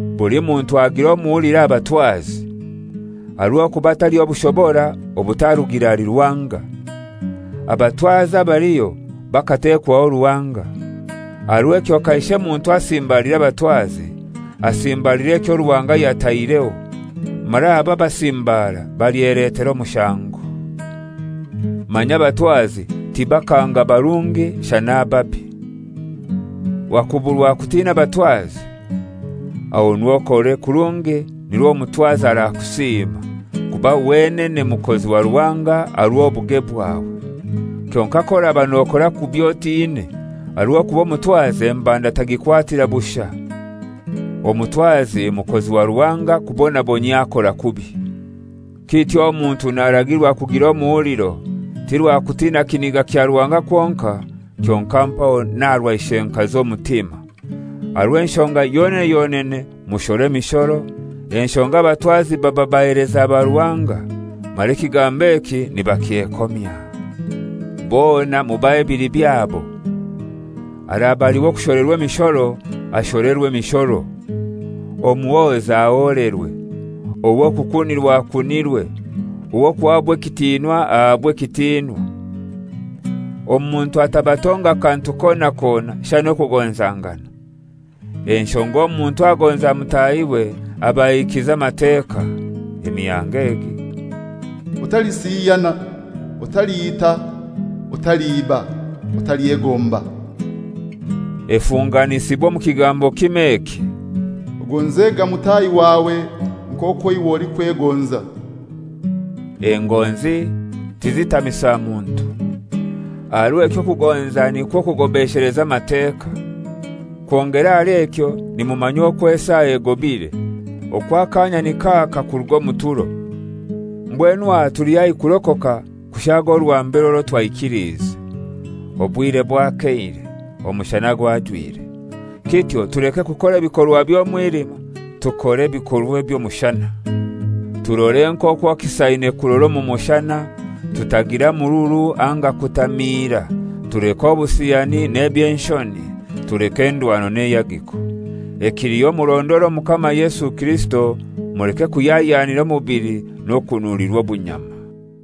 Buli muntu agire omuhuliro aha batwazi. Aha rw'okuba taliho bushobora obutarugire ahali Ruhanga. Abatwazi abaliho bakatekwaho Ruhanga. Aha rw'ekyo kaishe muntu asimbalira abatwazi, asimbalira ekyo Ruhanga yataireho, mara abo abasimbaara balyeletera omushango. Manya abatwazi tibakanga barungi shana ababi. Wakuburwa kutina abatwazi? Ahonu okore kurungi nirwo omutwazi arakusiima, kuba wenene mukozi wa Ruhanga aha rw'obuge bwawe. Kyonkai k'oraba nokora kubi otine, aha rw'okuba omutwazi embanda tagikwatira bushai. Omutwazi mukozi wa Ruhanga kubonabonyia akora kubi. Kityo omuntu naragirwa kugira omuhuliro, ti rwa kutina kiniga kya Ruhanga kwonkai, kyonkai mpaho n'aha rwa ishenkazi omutima. Aha rw'enshonga yonene yonene mushora emishoro, enshonga abatwazi baba baheleza ba Ruhanga, mara ekigambo eki nibakyekomya. Bona mubahe ebili byabo. Araba ali w'okusholerwa emishoro, asholerwe emishoro; omuhoza aholerwe; ow'okukunirwa akunirwe; ow'okuhabwa ekitinwa ahabwe ekitinwa. Omuntu atabatonga kantu kona kona, shana okugonzangana. Enshonga omuntu agonza mutahiwe aba ahikize Amateka. Emihango egi: «Otalisiyana, Otaliita, Otaliiba, Otalyegomba,» efunganisibwa omu kigambo kimoi eki, «Ogonzega mutahi wawe nk'okwo iwe olikwegonza.» Engonzi tizitamisa muntu. Aha rw'ekyo okugonza nikwo kugobesheleza Amateka. Kwongera ahali ekyo nimumanya okwo esaa egobire, okwo akaanya nik'aka kuruga omu turo. Mbwenu aha tuli haihi kurokoka kushaaga orwa mbere orwo twaikiliize. Obwire bwakeire, omushana gwajwire. Kityo tulekere kukora ebikorwa by'omwilima, tukore ebikorwa eby'omushana. Turore nk'okwo kisaine kurora omu mushana, tutagira mururu anga kutamiira, tuleke obusiyani n'eby'enshoni, tuleke endwano n'eihagiko. Ekiliho murondore Omukama Yesu Kirisito, muleke kuhyahyanira omubili, n'okunulirwa obunyama.